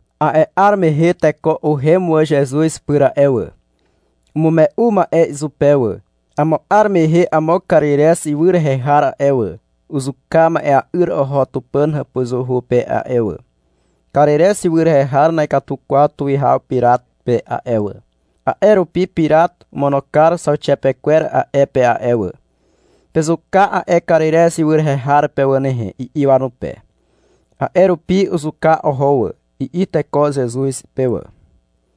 A'e 'ar mehe teko uhem wà Zezuz pyr a'e wà. Umume'u ma'e izupe wà. — Amo 'ar mehe amo Karirez ywy rehe har a'e wà, uzuka ma'ea'yr oho Tupàn hàpuzuhu pe a'e wà. Karirez ywy rehe har na'ikatu kwaw tuwihaw Pirat pe a'e wà, a'e rupi Pirat omono kar zauxiapekwer a'e pe a'e wà. — Pezuka a'e Karirez ywy rehe har pe wà nehe, i'i wanupe. A'e rupi uzuka oho wà, i'i teko Zezuz pe wà.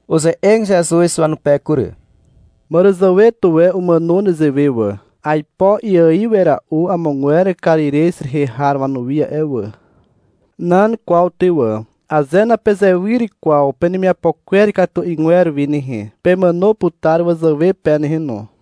Uze'eg Zezuz wanupe kury. — Màràzàwe tuwe umàno nezewe wà. Aipo iaiw wera'u amogwer Karirez rehe har wanuwi a'e wà. Nan kwaw ty wà. Aze napezewyr kwaw penemiapo kwer ikatu 'ygwer wi nehe, pemàno putar wazàwe pe nehe no.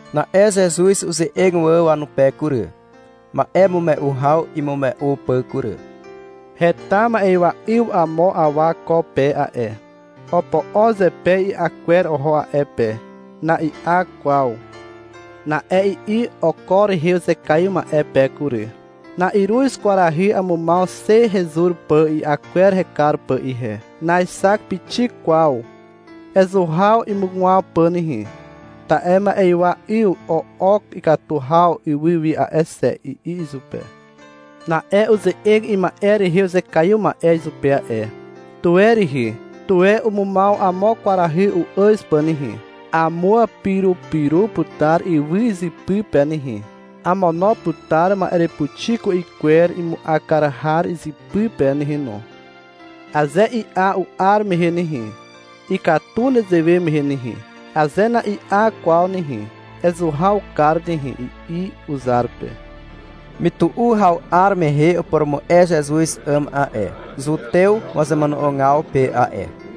Na'e Zezuz uze'eg wà wanupe kury, ma'emume'u haw imume'u pà kury. — Heta ma'ywa 'yw amo awa ko pe a'e. Opo'o zepe i'a kwer oho a'e pe. Na'i'a kwaw. Na'e i'i oko rehe uzekaiw ma'e pe kury. — Na'iruz kwarahy amumaw xe hezur pà i'a kwer hekar pà ihe. Naexak pixik kwaw. Ezuhaw imugwaw pà nehe, ta'e ma'ywa 'yw o'ok ikatu haw ywy wi a'e xe, i'i izupe. Na'e uze'eg ima'e rehe uzekaiw ma'e izupe a'e. — Tuwe rihi, tuwe umumaw amo kwarahy u'àz pà nehe. Amuapirupiru putar ywy izypy pe nehe, amono putar ma'erepuxi ku'i kwer imu'a kar har izypy pe nehe no. Aze i'a u'ar mehe nehe, ikatu nezewe mehe nehe. Aze na'i'a kwaw nehe, ezuhaw kar nehe, i'i uzar pe. Mytu'u haw 'ar mehe upurumu'e Zezuz 'àm a'e, zutew wazemono'ogaw pe a'e.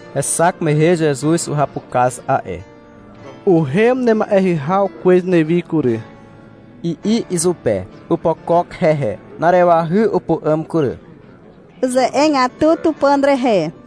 Hexak mehe Zezuz uhapukaz a'e. — Uhem nema'eahy haw kwez newi kury, i'i izupe. Opokok hehe. Na'arewahy upu'àm kury. Uze'egatu Tupàn rehe.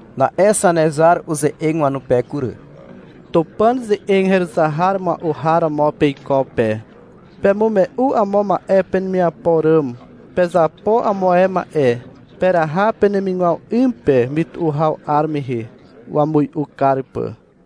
Na'e Zanezar uze'eg wanupe kury. — Tupàn ze'eg heruzar mua'u har romo peiko pe. Pemume'u amo ma'e penemiapo ràm. Pezapo amo ae ma'e. Peraha peneimaw 'y pe mytu'u haw 'ar mehe, wamui'u kar pà.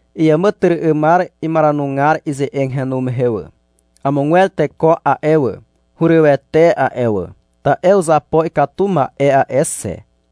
Iàmàtyry'ymar imaranugar ize'eg henu mehe wà. Amogwer teko a'e wà, hurywete a'e wà, ta'e uzapo ikatu ma'e a'e xe.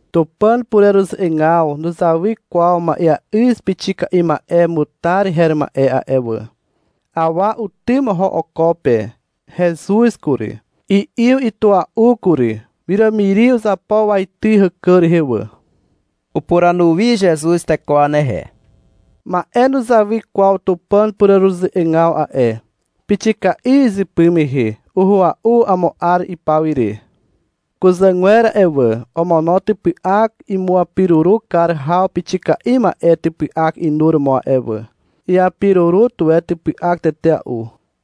Tupàn pureruze'egaw nuzawy kwaw ma'eà'yz pixika'i ma'e mutar her ma'e a'e wà. Awa utym oho oko pe. Hezuz kury. I'yw itua'u kury. Wiràmiri uzapo waity hàkà rehe wà. Upuranu wi Zezuz teko wanehe. — Ma'e nuzawy kwaw Tupàn pureruze'egaw a'e. Pixika'i izypy mehe. Uhua'u amo 'ar ipawire. Kuzàgwer a'e wà, omono typy'ak imuapiruru kar haw pixika'i ma'e typy'ak inuromo a'e wà. Iapiruru tuwe typy'ak tetea'u.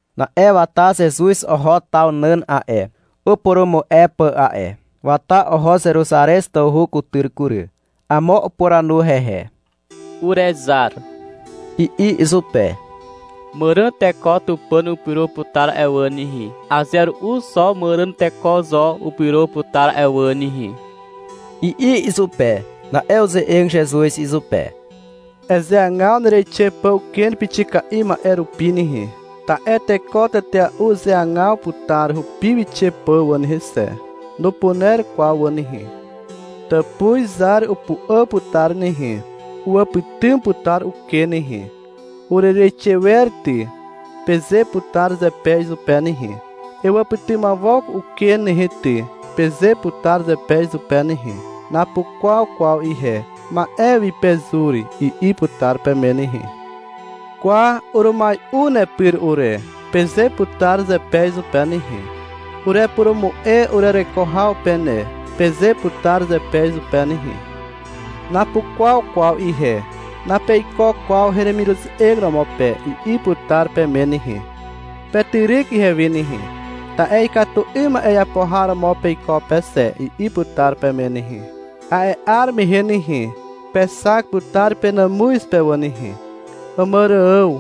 Na'e wata Zezuz oho taw nàn a'e, upurumu'e pà a'e. Wata oho Zeruzarez tawhu kutyr kury. Amo upuranu hehe. — Urezar, i'i izupe. — Màràn teko Tupàn upyro putar a'e wà nehe. Aze ru'u xo màràn teko zo upyro putar a'e wà nehe, i'i izupe. Na'e uze'eg Zezuz izupe. Ezeagaw nereixe pà uken pixika'i ma'e rupi nehe. Ta'e teko tetea'u uzeagaw putar hupi wixe pà wà nehe xe. Nupuner kwaw wà nehe. Tàpuz zar upu'àm putar nehe, uwàpytym putar uken nehe. — Urereixe wer ty, peze putar zepe izupe nehe. — Ewàpytymawok uken nehe ty, peze putar zepe izupe nehe. — Napukwaw kwaw ihe, ma'e wi pezur, i'i putar peme nehe. — Kwa, urumai'u nepyr ure, peze putar zepe izupe nehe, — Erepurumu'e urereko haw pe ne, peze putar zepe izupe nehe. — Napukwaw kwaw ihe, napeiko kwaw heremiruze'eg romo pe, i'i putar peme nehe. — Petyryk ihewi nehe, ta'e ikatu 'ym ma'e iapo har romo peiko pe xe, i'i putar peme nehe. A'e 'ar mehe nehe, pexak putar penàmuz pe wà nehe: Àmàrààw,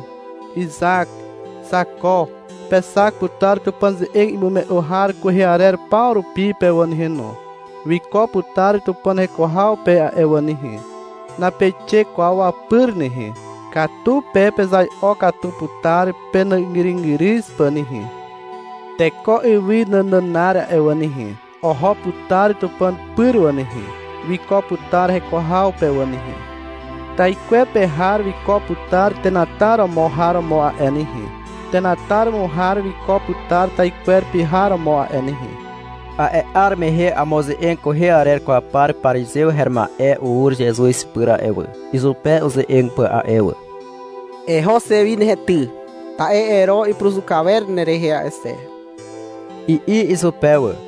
Izak, Zako. Pexak putar Tupàn ze'eg imume'u har kwehe arer paw rupi pe wà nehe no. Wiko putar Tupàn heko haw pe a'e wà nehe. Napeixe kwaw wapyr nehe. Katu pe pezai'o katu putar penàzgyrygyryz pà nehe. Teko ywy nànànar a'e wà nehe, oho putar Tupàn pyr wà nehe. Wiko putar heko haw pe wà nehe. Taikwepe har wiko putar tenataromo har romo a'e nehe. Tenataromo har wiko putar taikwepe har romo a'e nehe. A'e 'ar mehe amo ze'eg kwehe arer kwaw par parizew her ma'e ur Zezuz pyr a'e wà, izupe uze'eg pà a'e wà. — Eho xe wi nehe ty, ta'e Ero ipuruzuka wer nerehe a'e xe, i'i izupe wà.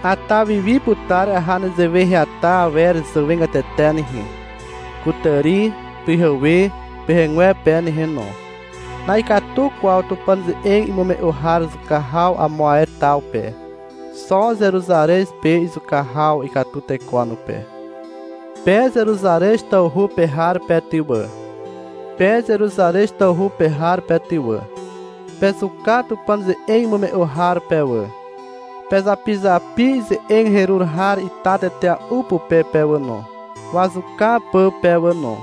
Ata wiwi putar aha nezewe heata awer zàwegatete nehe: kutàri, pyhewe, pyhegwepe nehe no. Na'ikatu kwaw Tupàn ze'eg imume'u har zuka haw amo ae taw pe. Xo Zeruzarez pe izuka haw ikatu teko wanupe. Pe Zeruzarez tawhu pe har pe ty wà, pe Zeruzarez tawhu pe har pe ty wà, pezuka Tupàn ze'eg imume'u har pe wà, pezapizapi ize'eg herur har ita tetea'u pupe pe wà no, wazuka pà pe wà no.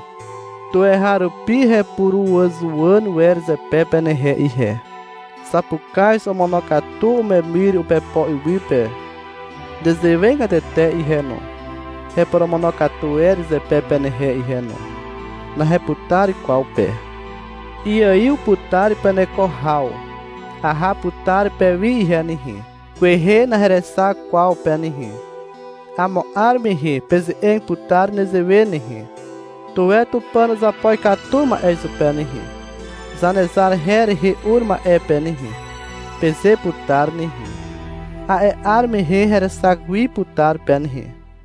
Tuweharupi hepuruàzuwàn wer zepe penehe ihe. Zapukaz omonokatu umemyr upepo iwy pe. Nezewegatete ihe no, heporomonokatu wer zepe penehe ihe no. Naheputar kwaw pe. Iaiw putar peneko haw. Aha putar pewi ihe nehe. Kwehe naherexak kwaw pe nehe. Amo 'ar mehe peze'eg putar nezewe nehe, — Tuwe Tupàn uzapo ikatu ma'e izupe nehe, Zanezar her rehe ur ma'e pe nehe, peze putar nehe. A'e 'ar mehe herexak wi putar pe nehe.